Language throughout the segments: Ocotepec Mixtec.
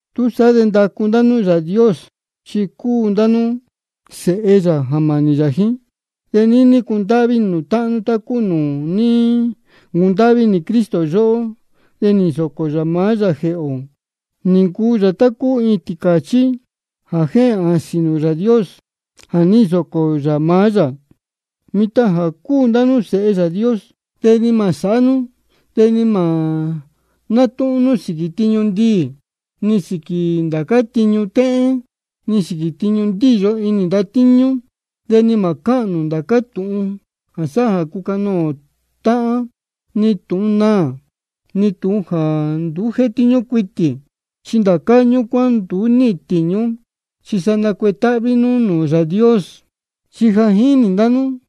Túsaá de ndacu ndá nú Yāā Dios, chi cúu ndá nú sēhe yā jā mānī yā jíín. De níní cundáhví inī nū táhán nú, tá cúu nūū ní ncundáhví inī Cristo yóhó, de nī nsōcō yā maá yā jēhē ō, nī ncuu yā tá cúu iin tīcāchí jā jéhēn āsīn nūū Yāā Dios jā ní nsōcō yā maá yā. De mitan jā cúu ndá nú sēhe Yāā Dios, de ni mā sāhá nú de ni mā nátúhún nú sīquī tiñu ndiī, ni sīquī ndācá tiñu téhén, ni sīquī tiñu ndíyo inī ndatíñú. De ni mā cáhān nū ndācá tūhun jā sáhá jā cúcanoō táhán, ni tūhun naā, ni tūhun jāá nduú jétíñú cuitī. Chi ndācá ñúcuán nduú níhīn tīñú. Chi sa nacuetáhví nú nūū Yāā Dios. Chi ja jínī ndá nú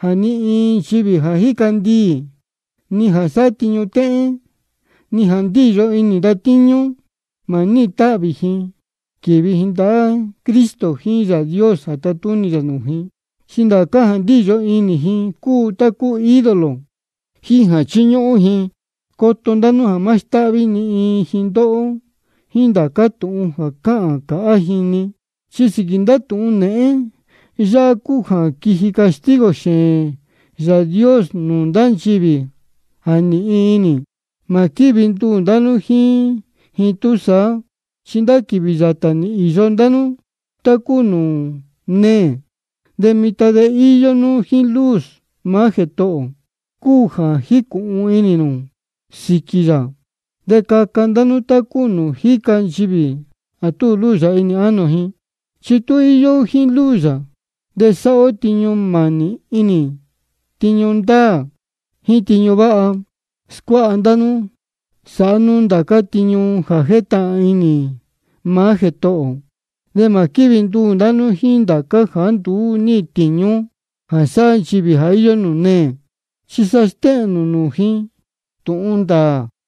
jā ni iin nchivī jā jíca ndiī, ni jā sáhá tiñu téhén, ni jā ndíyo inī ndatíñú, mā níhīn táhvī ji quīvi ji ndahá Cristo jíín Yāā Dios jā tatúnī yā nūū ji. Chi ndācá jā ndíyo inī ji cúu tá cúu ídolo ji jā chíñúhún ji. De coto ndá nú jā má stáhví ni iin ji ndóhó jíín ndācá tūhun jā cáhān cāhá ji-ni, chi sīquī ndá tūhun nēhén yáhá cúu jā quíji castigo xēēn Yāā Dios nūū ndá nchivī jā nīhin inī. Mā quívi nduū nū jíín ji túsaá. Chi ndá quīvī yātā nī īyo ndá nú tá cúu nūū neē, de mitan chi íyó nú jíín luz maá Jētohō ō, cúu jā jícūhun inī nū sīquī yā. De caca nú tá cúu nūū jíca nchivī jā túu luz yā inī ánō ji. Chi tú íyó ó jíín luz yā de sáhá ó tiñu mānī inī, tiñu ndāā, jíín tiñu váha. Scuáha ndá nú sāhá nú ndācá tiñu jā jétahān inī maá Jētohō ō. De mā quívi nduū nū jíín ndācá jāá nduú níhīn tīñú jā sáhá nchivī jā íyó nūū neē. Chi sa stéhēn nū nūū ji tūhun ndāā.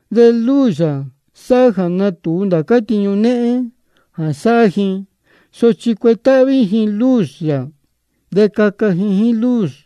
De luz yā sáhá jā nátūu ndācá tiñu néhén jā sáhá ji. Sochi tú cuetáhví ji luz yā de caca ji jíín luz.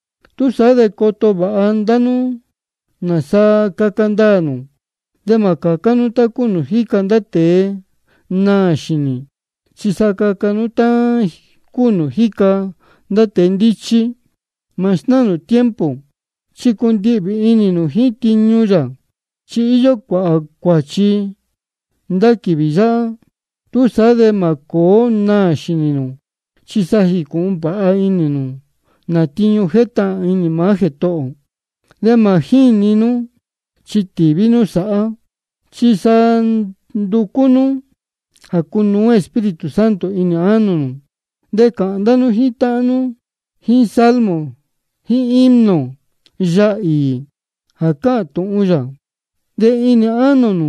Túsaá de coto vāha ndá nú nāsa caca ndaā nū. De mā cācá nú tá cúu nūū jíca ndá tēe naā xīnī, chi sa caca nú tá cúu nūū jíca ndá tēe ndíchí. Mā snáā nū tiempo, chi cundihvī inī nū jíín tiñu yā, chi íyó cuāhā cuāchi ndá quīvī yáhá. Túsaá de mā cōó naā xīnī nū, chi sa jīcūhun vāha inī nū nā tiñu jétahān inī maá Jētohō ō. De mā jíni nú, chi tīví nú sāhá. Chi sa nducú nú jā cunuú Espíritu Santo inī ánō nū. De cāhān ndá nú jíín táhán nú jíín salmo jíín himno, yaā īī jā cáhān tūhun yā. De inī ánō nū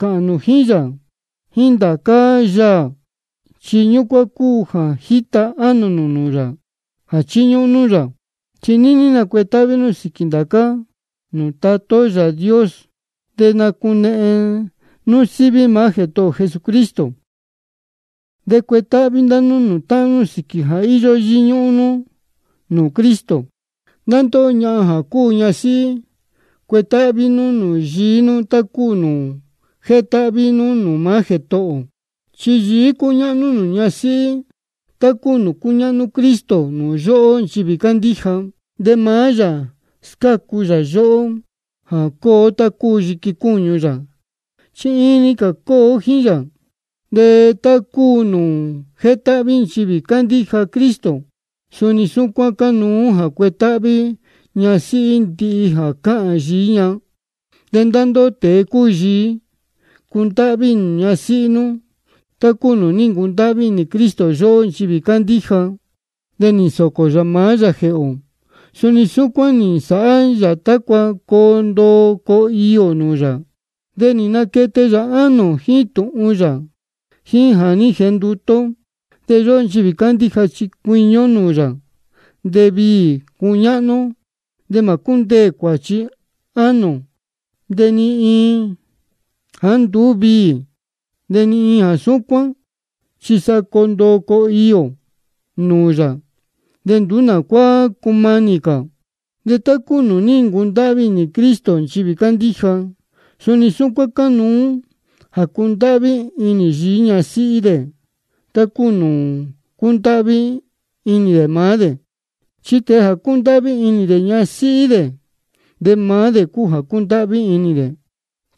cāhān nū jíín yā jíín ndācá yaā, chi ñúcuán cúu jā jíta ánō nū nūū yā jā chíñúhún nú yā. De níní nacuetáhví nú sīquī ndācá-ni nūū Tatá ó Yāā Dios de nacunehen nú síví maá Jētohō ō Jesucristo. De cuetáhví ndá nú nūū táhán nú sīquī jā íyó yíñúhún nú nūū Cristo. Ndá ndóhó ñahan jā cúu ñasíhí, cuetáhví nú nūū yií nú, tá cúu nūū jétáhví nú nūū maá Jētohō ō. Chi yií cúñáhnú nūū ñasíhí, tá cúu nūū cúñáhnú Cristo nūū yóhó nchivī cándíja. De maá yā scácu yā yóhó, jā cúu ó tá cúu yiqui cúñu yā, chi iin-ni cā cúu ó jíín yā. De tá cúu nūū jétáhví nchivī cándíja nūū Cristo, suni súcuán cánuú jā cuetáhví ñasíhí ndihi jā cáhān yií ña. De ndá ndóhó tēe cúu yií, cundáhví inī nū ñasíhí nú, tá cúu nūū ní ncundáhví inī Cristo yóhó nchivī cándíja, de nī nsōcō yā maá yā jēhē ō. Súcuán nī nsāhá yā tácua coo ndoo coo iī ō nūū yā, de nī naquete yā ánō ō jíín tūhun yā jíín jā ní jenduté ó. De yóhó nchivī cándíja chi cuiñi ó nūū yā, de viī cuñáhnú ó. De mā cúndeē cuāchi ánō ō, de ni iin jāá nduú viī, de ni iin jā súcuán, chi sa coo ndoo coo iī ō nūū yā, de nduú nā cuá cumanī cā. De tá cúu nūū ní ncundáhví inī Cristo nchivī cándíja, suni súcuán cánuú jā cundáhví inī yií ñasíhí dē, tá cúu nūū cúndáhví inī dē maá dē. Chi tēe jā cúndáhví inī dē ñasíhí dē, maá dē cúu jā cúndáhví inī dē.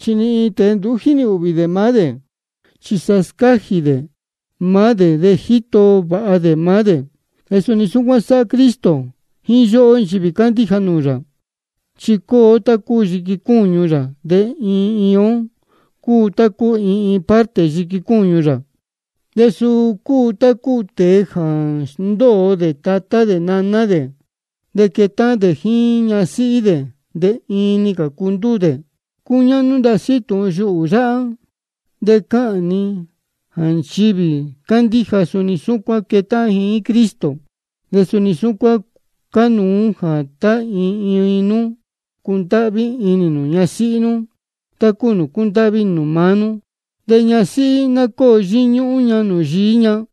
Chi ni iin tēe nduú jínī ūhvī dē maá dē, chi sa scájī dē maá dē de jíto vāha dē maá dē. De suni súcuán sáhá Cristo jíín yóhó nchivī cándíja nūū yā. Chi cúu ó tá cúu yiqui cúñu yā, de iin iin ó cúu tá cúu iin iin parte yiqui cúñu yā. De suu cúu tá cúu tēe jā sndóo dē tatá dē naná dē, de quétáhán dē jíín ñasíhí dē, de iin-ni cā cúu ndúū dē. Cúñáhnú ndasí tūhun yuhū yáhá, de cáhān ni jā nchivī cándíja suni súcuán quétáhán ji jíín Cristo. De suni súcuán cánuú jā tá iin iin nú cundáhví inī nū ñasíhí nú, tá cúu nūū cúndáhví inī nū maá nú. De ñasíhí ná cóo yíñúhún ña jíín yií ña.